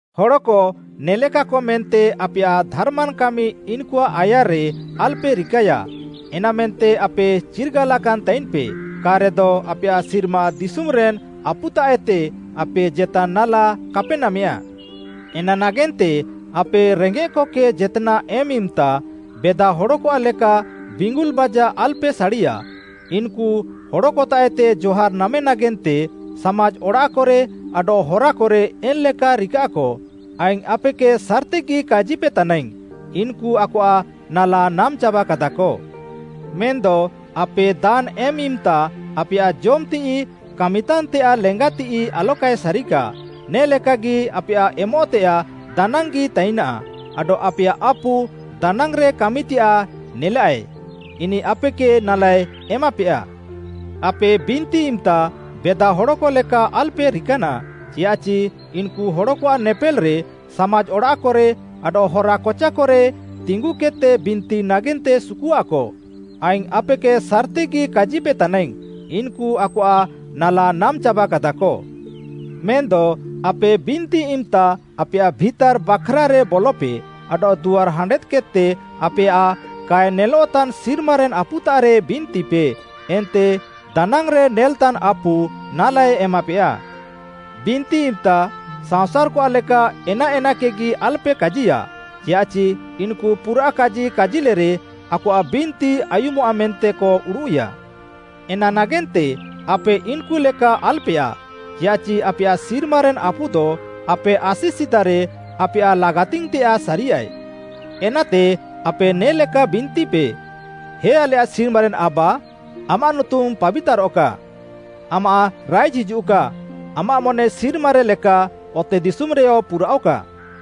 “ହଡ଼କ ନେଲେକା ମେନ୍ତେ ଆପେୟାଃ ଧାର୍‌ମାନ୍‌ କାମି ଇନ୍‌କୁଆଃ ଆୟାର୍‌ରେ ଆଲ୍‌ପେ ରିକାୟା, ଏନାମେନ୍ତେ ଆପେ ଚିର୍ଗାଲାକାନ୍‌ ତାଇନ୍‌ପେ, କା'ରେଦ ଆପେୟାଃ ସିର୍ମା ଦିଶୁମ୍‌ରେନ୍‌ ଆପୁତାଃଏତେ ଆପେ ଜେତାନ୍‌ ନାଲା କାପେ ନାମେୟା। “ଏନା ନାଗେନ୍ତେ ଆପେ ରେଙ୍ଗେଃକକେ ଜେତ୍‌ନାଃ ଏମ୍‌ ଇମ୍‌ତା ବେଦାହଡ଼କଆଃ ଲେକା ବିଙ୍ଗୁଲ୍‌ ବାଜା ଆଲ୍‌ପେ ସାଡ଼ିଆ, ଇନ୍‌କୁ ହଡ଼କତାଃଏତେ ଜହାର୍‌ ନାମେ ନାଗେନ୍ତେ ସାମାଜ୍‌ ଅଡ଼ାଃକରେ ଆଡଃ ହରାକରେ ଏନ୍‌ଲେକା ରିକାଃକ। ଆଇଙ୍ଗ୍‌ ଆପେକେ ସାର୍‌ତିଗି କାଜିପେତାନାଇଙ୍ଗ୍‌, ଇନ୍‌କୁ ଆକଆଃ ନାଲା ନାମ୍‌ ଚାବାକାଦାକ। ମେନ୍‌ଦ ଆପେ ଦାନ୍‌ ଏମ୍‌ ଇମ୍‌ତା ଆପେୟାଃ ଜମ୍‌ତିଃଇ କାମିତାନ୍‌ତେୟାଃ ଲେଙ୍ଗାତିଃଇ ଆଲକାଏ ସାରିକା, ନେ ଲେକାଗି ଆପେୟାଃ ଏମଃତେୟାଃ ଦାନାଙ୍ଗି ତାଇନାଃ, ଆଡଃ ଆପେୟାଃ ଆପୁ ଦାନାଙ୍ଗ୍‌ରେ କାମିତେୟାଃ ନେଲାଃଏ, ଇନିଃ ଆପେକେ ନାଲାଏ ଏମାପେୟା। “ଆପେ ବିନ୍ତି ଇମ୍‌ତା ବେଦାହଡ଼କ ଲେକା ଆଲ୍‌ପେ ରିକାନାଃ, ଚିୟାଃଚି ଇନ୍‌କୁ ହଡ଼କଆଃ ନେପେଲ୍‌ରେ ସାମାଜ୍‌ ଅଡ଼ାଃକରେ ଆଡଃ ହରା କଚାକରେ ତିଙ୍ଗୁକେଦ୍‌ତେ ବିନ୍ତି ନାଗେନ୍ତେ ସୁକୁଆଃକ, ଆଇଙ୍ଗ୍‌ ଆପେକେ ସାର୍‌ତିଗି କାଜିପେତାନାଇଙ୍ଗ୍‌, ଇନ୍‌କୁ ଆକଆଃ ନାଲା ନାମ୍‌ ଚାବାକାଦାକ। ମେନ୍‌ଦ ଆପେ ବିନ୍ତି ଇମ୍‌ତା ଆପେୟାଃ ଭିତାର୍‌ ବାଖ୍‌ରାରେ ବଲପେ ଆଡଃ ଦୁଆର୍‌ ହାଣ୍ଡେଦ୍‌କେଦ୍‌ତେ ଆପେୟାଃ କାଏ ନେଲଃତାନ୍‌ ସିର୍ମାରେନ୍‌ ଆପୁତାଃରେ ବିନ୍ତିପେ ଏନ୍ତେ ଦାନାଙ୍ଗ୍‌ରେ ନେଲ୍‌ତାନ୍‌ ଆପୁ ନାଲାଏ ଏମାପେୟା। “ବିନ୍ତି ଇମ୍‌ତା ସାଅଁସାର୍‌କ ଲେକା ଏନାଏନାକେଗି ଆଲ୍‌ପେ କାଜିୟା, ଚିୟାଃଚି ଇନ୍‌କୁ ପୁରାଃ କାଜି କାଜିଲେରେ ଆକଆଃ ବିନ୍ତି ଆୟୁମଃଆ ମେନ୍ତେକ ଉଡ଼ୁଃୟା। ଏନା ନାଗେନ୍ତେ ଆପେ ଇନ୍‌କୁ ଲେକା ଆଲ୍‌ପେୟାଃ, ଚିୟାଃଚି ଆପେୟାଃ ସିର୍ମାରେନ୍‌ ଆପୁଦ ଆପେ ଆସି ସିଦାରେ ଆପେୟାଃ ଲାଗାତିଙ୍ଗ୍‌ତେୟାଃ ସାରିୟାଏ। ଏନାତେ ଆପେ ନେ ଲେକା ବିନ୍ତିପେ, “‘ହେ ଆଲେୟାଃ ସିର୍ମାରେନ୍‌ ଆବା; ଆମାଃ ନୁତୁମ୍‌ ପାବିତାରଃକା; ଆମାଃ ରାଇଜ୍‌ ହିଜୁଃକା; ଆମାଃ ମନେ ସିର୍ମାରେ ଲେକା ଅତେଦିଶୁମ୍‌ରେୟ ପୁରାଅଃକା।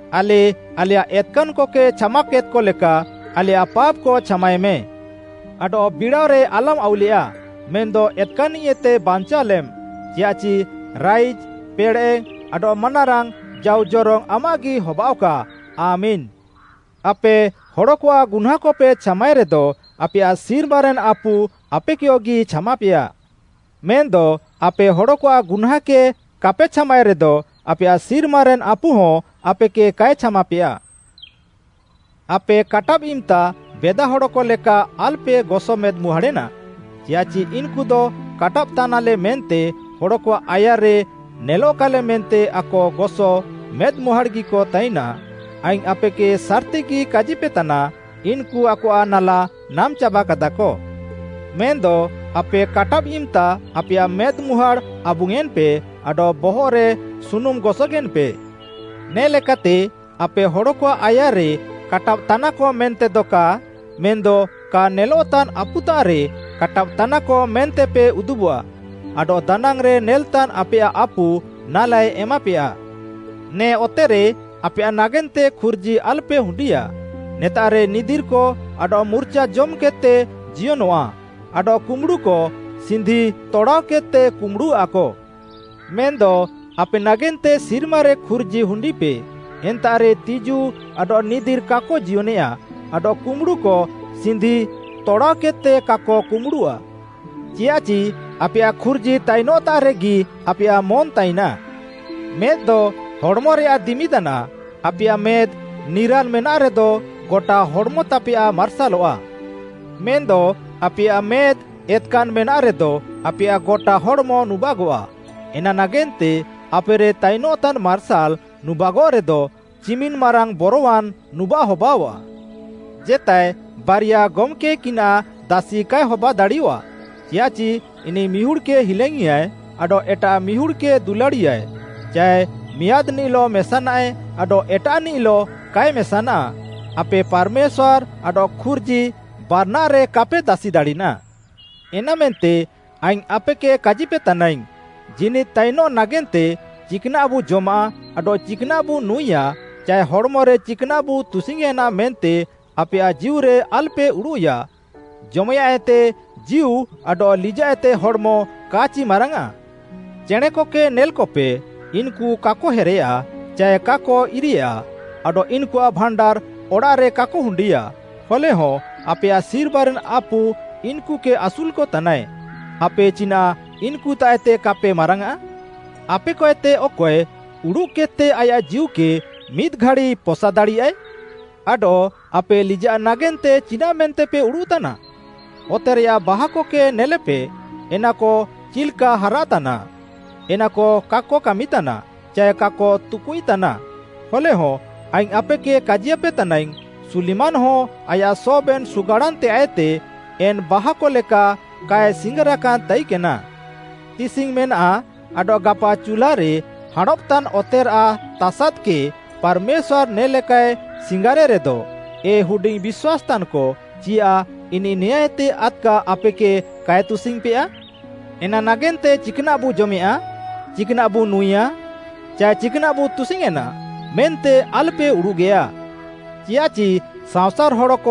ଆଲେ ଆଲେୟାଃ ଏତ୍‌କାନ୍‌କକେ ଛାମାକେଦ୍‍କ ଲେକା, ଆଲେୟାଃ ପାପ୍‌କ ଛାମାଏମେଁ। ଆଡଃ ବିଡ଼ାଅରେ ଆଲମ୍‌ ଆଉଲେୟା, ମେନ୍‌ଦ ଏତ୍‌କାନ୍‌ନିଃଏତେ ବାଞ୍ଚାଅଲେମ୍‌। ଚିୟାଃଚି ରାଇଜ୍‌, ପେଡ଼େଃ ଆଡଃ ମାନାରାଙ୍ଗ୍‌ ଜାଉ ଜରଙ୍ଗ୍‌ ଆମାଃଗି ହବାଅଃକା, ଆମେନ୍‌।’ “ଆପେ ହଡ଼କଆଃ ଗୁହ୍ନାଁଁକପେ ଛାମାଏରେଦ, ଆପେୟାଃ ସିର୍ମାରେନ୍‌ ଆପୁ ଆପେକେୟଗି ଛାମାପେୟା। ମେନ୍‌ଦ ଆପେ ହଡ଼କଆଃ ଗୁହ୍ନାଁଁକେ କାପେ ଛାମାଏରେଦ, ଆପେୟାଃ ସିର୍ମାରେନ୍‌ ଆପୁହଁ ଆପେକେ କାଏ ଛାମାପେୟା। “ଆପେ କାଟାବ୍‌ ଇମ୍‌ତା ବେଦାହଡ଼କ ଲେକା ଆଲ୍‌ପେ ଗସ ମେଦ୍‌ମୁହାଁଡ଼େନା, ଚିୟାଃଚି ଇନ୍‌କୁଦ କାଟାବ୍‌ତାନାଲେ ମେନ୍ତେ ହଡ଼କଆଃ ଆୟାର୍‌ରେ ନେଲଃକାଲେ ମେନ୍ତେ ଆକ ଗସ ମେଦ୍‌ମୁହାଁଡ଼୍‌ଗିକ ତାଇନାଃ। ଆଇଙ୍ଗ୍‌ ଆପେକେ ସାର୍‌ତିଗି କାଜିପେତାନା, ଇନ୍‌କୁ ଆକଆଃ ନାଲା ନାମ୍‌ ଚାବାକାଦାକ। ମେନ୍‌ଦ ଆପେ କାଟାବ୍‌ ଇମ୍‌ତା ଆପେୟାଃ ମେଦ୍‌ମୁହାଁଡ଼୍‌ ଆବୁଙ୍ଗ୍‌ୟେଁନ୍‌ପେ ଆଡଃ ବହଃରେ ସୁନୁମ୍‌ ଗସଗେନ୍‌ପେ। ନେ ଲେକାତେ ଆପେ ହଡ଼କଆଃ ଆୟାର୍‌ରେ କାଟାବ୍‌ତାନାକ ମେନ୍ତେଦ କା ମେନ୍‌ଦ କା ନେଲଃତାନ୍‌ ଆପୁତାଃରେ କାଟାବ୍‌ତାନାକ ମେନ୍ତେପେ ଉଦୁବଃଆ, ଆଡଃ ଦାନାଙ୍ଗ୍‌ରେ ନେଲ୍‌ତାନ୍‌ ଆପେୟାଃ ଆପୁ ନାଲାଏ ଏମାପେୟା। “ନେ ଅତେରେ ଆପେୟାଃ ନାଗେନ୍ତେ ଖୁର୍ଜି ଆଲ୍‌ପେ ହୁଣ୍ଡିଆଃ, ନେତାଃରେ ନିଦିର୍‌କ ଆଡଃ ମୁର୍ଚାଜମ୍‌କେଦ୍‌ତେ ଜିୟନଃଆ ଆଡଃ କୁମ୍ବୁଡ଼ୁକ ସିନ୍ଧି ତଡ଼ାଅକେଦ୍‌ତେ କୁମ୍ବୁଡ଼ୁଆଃକ। ମେନ୍‌ଦ ଆପେ ନାଗେନ୍ତେ ସିର୍ମାରେ ଖୁର୍ଜି ହୁଣ୍ଡିପେ, ଏନ୍ତାଃରେ ତିଜୁ ଆଡଃ ନିଦିର୍‌ କାକ ଜିୟନେଆ ଆଡଃ କୁମ୍ବୁଡ଼ୁକ ସିନ୍ଧି ତଡ଼ାଅକେଦ୍‌ତେ କାକ କୁମ୍ବୁଡ଼ୁଆଃ। ଚିୟାଃଚି ଆପେୟାଃ ଖୁର୍ଜି ତାଇନଃତାଃରେଗି ଆପେୟାଃ ମନ୍‌ ତାଇନାଃ। “ମେଦ୍‌ଦ ହଡ଼୍‌ମରେୟାଃ ଦିମି ତାନାଃ, ଆପେୟାଃ ମେଦ୍‌ ନିରାଲ୍‌ ମେନାଃରେଦ ଗଟା ହଡ଼୍‌ମତାପେୟାଃ ମାର୍ସାଲଃଆ। ମେନ୍‌ଦ ଆପେୟାଃ ମେଦ୍‌ ଏତ୍‌କାନ୍‌ ମେନାଃରେଦ, ଆପେୟାଃ ଗଟା ହଡ଼୍‌ମ ନୁବାଗଃଆ। ଏନା ନାଗେନ୍ତେ ଆପେରେ ତାଇନଃତାନ୍‌ ମାର୍ସାଲ୍‌ ନୁବାଗଃରେଦ, ଚିମିନ୍‌ ମାରାଙ୍ଗ୍‌ ବରୱାନ୍‌ ନୁବାଃ ହବାଅଆଃ। “ଜେତାଏ ବାରିଆ ଗମ୍‌କେକିନାଃ ଦାସି କାଏ ହବାଦାଡ଼ିୟଃଆ। ଚିୟାଃଚି ଇନିଃ ମିହୁଡ଼୍‌କେ ହିଲାଙ୍ଗ୍‌ଇୟାଏ ଆଡଃ ଏଟାଃ ମିହୁଡ଼୍‌କେ ଦୁଲାଡ଼ିୟାଏ, ଚାଏ ମିଆଁଦ୍‌ନିଃଲଃ ମେସାନାଏ ଆଡଃ ଏଟାଃନିଃଲଃ କାଏ ମେସାନା। ଆପେ ପାର୍‌ମେଶ୍ୱାର୍‌ ଆଡଃ ଖୁର୍ଜି ବାରାନାଃରେ କାପେ ଦାସିଦାଡ଼ିନା।” “ଏନାମେନ୍ତେ ଆଇଙ୍ଗ୍‌ ଆପେକେ କାଜିପେତାନାଇଙ୍ଗ୍‌, ଜୀନିଦ୍‌ ତାଇନଃ ନାଗେନ୍ତେ ଚିକ୍‌ନାଃବୁ ଜମାଃ ଆଡଃ ଚିକ୍‌ନାଃବୁ ନୁଁଏୟା, ଚାଏ ହଡ଼୍‌ମରେ ଚିକ୍‌ନାଃବୁ ତୁସିଙ୍ଗ୍‌ୟେଁନା ମେନ୍ତେ ଆପେୟାଃ ଜୀଉରେ ଆଲ୍‌ପେ ଉଡ଼ୁଃୟା। ଜମେୟାଁଃଏତେ ଜୀଉ ଆଡଃ ଲିଜାଃଏତେ ହଡ଼୍‌ମ କା'ଚି ମାରାଙ୍ଗ୍‌ଆଁ? ଚେଣେଁକକେ ନେଲ୍‌କପେ, ଇନ୍‌କୁ କାକ ହେରେୟା ଚାଏ କାକ ଇରେୟା, ଆଡଃ ଇନ୍‌କୁଆଃ ଭାଣ୍ଡାର୍‌ ଅଡ଼ାଃରେ କାକ ହୁଣ୍ଡିଆଃ, ହଲେହଁ ଆପେୟାଃ ସିର୍ମାରେନ୍‌ ଆପୁ ଇନ୍‌କୁକେ ଆସୁଲ୍‌କତାନାଏ। ଆପେ ଚିନାଃ ଇନ୍‌କୁତାଃଏତେ କାପେ ମାରାଙ୍ଗ୍‌ଆଃ? ଆପେକଏତେ ଅକଏ ଉଡୁଃକେଦ୍‌ତେ ଆୟାଃ ଜୀଉକେ ମିଦ୍‌ ଘାଡ଼ି ପସାଦାଡ଼ିୟାଏ? “‘ଆଡଃ ଆପେ ଲିଜାଃ ନାଗେନ୍ତେ ଚିନାଃ ମେନ୍ତେପେ ଉଡ଼ୁଃତାନା? ଅତେରେୟାଃ ବାହାକକେ ନେଲେପେ, ଏନାକ ଚିଲ୍‌କା ହାରାତାନା, ଏନାକ କାକ କାମିତାନା, ଚାଏ କାକ ତୁକୁଇତାନା, ହଲେହଁ ଆଇଙ୍ଗ୍‌ ଆପେକେ କାଜିୟାପେ ତାନାଇଙ୍ଗ୍‌, ସୁଲିମାନ୍‌ହଁ ଆୟାଃ ସବେନ୍‌ ସୁଗାଡ଼ାନ୍‌ତେୟାଃଏତେ ଏନ୍‌ ବାହାକ ଲେକା କାଏ ସିଙ୍ଗାରାକାନ୍ ତାଇକେନା।’ ତିସିଙ୍ଗ୍‌ ମେନାଃ ଆଡଃ ଗାପା ଚୁଲ୍ଲାରେ ହାଁଣବଃତାନ୍‌ ଅତେରାଃ ତାସାଦ୍‌କେ ପାର୍‌ମେଶ୍ୱାର୍‌ ନେ ଲେକାଏ ସିଙ୍ଗାର୍‌ରେ ରେଦ, ଏ ହୁଡିଙ୍ଗ୍‌ ବିଶ୍ୱାସ୍‌ତାନ୍‌କ, ଚିୟାଃ ଇନିଃ ନେଆଁଁଏତେ ଆଦ୍‌କା ଆପେକେ କାଏ ତୁସିଙ୍ଗ୍‌ପେୟା? “ଏନା ନାଗେନ୍ତେ ‘ଚିକ୍‌ନାଃବୁ ଜମେୟାଁ? ଚାଏ ଚିକ୍‌ନାଃବୁ ନୁଁଏୟା? ଚାଏ ଚିକ୍‌ନାଃବୁ ତୁସିଙ୍ଗ୍‌ୟେଁନା?’ ମେନ୍ତେ ଆଲ୍‌ପେ ଉଡ଼ୁଗେୟା। ଚିୟାଃଚି ସାଅଁସାର୍‌ ହଡ଼କ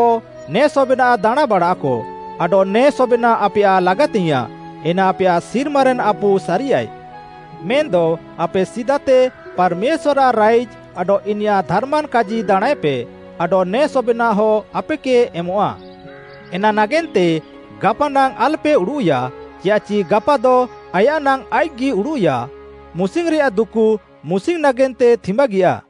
ନେ ସବେନାଃ ଦାଣାଁଁବାଡ଼ାଃକ, ଆଡଃ ନେ ସବେନାଃ ଆପେୟାଃ ଲାଗାତିଙ୍ଗ୍‌ୟାଁଃ, ଏନା ଆପେୟାଃ ସିର୍ମାରେନ୍‌ ଆପୁ ସାରିୟାଏ। ମେନ୍‌ଦ ଆପେ ସିଦାତେ ପାର୍‌ମେଶ୍ୱାର୍‌ଆଃ ରାଇଜ୍‌ ଆଡଃ ଇନିୟାଃ ଧାର୍‌ମାନ୍‌ କାଜି ଦାଣାଁଁଏପେ, ଆଡଃ ନେ ସବେନାଃହ ଆପେକେ ଏମଃଆ। ଏନା ନାଗେନ୍ତେ ଗାପାନାଙ୍ଗ୍‌ ଆଲ୍‌ପେ ଉଡ଼ୁଃୟା, ଚିୟାଃଚି ଗାପାଦ ଆୟାଃ ନାଙ୍ଗ୍‌ ଆଇଃକ୍‌ଗି ଉଡ଼ୁଃୟା। ମୁସିଙ୍ଗ୍‌ରେୟାଃ ଦୁକୁ ମୁସିଙ୍ଗ୍‌ ନାଗେନ୍ତେ ଥିମ୍ୱାଗିଆ।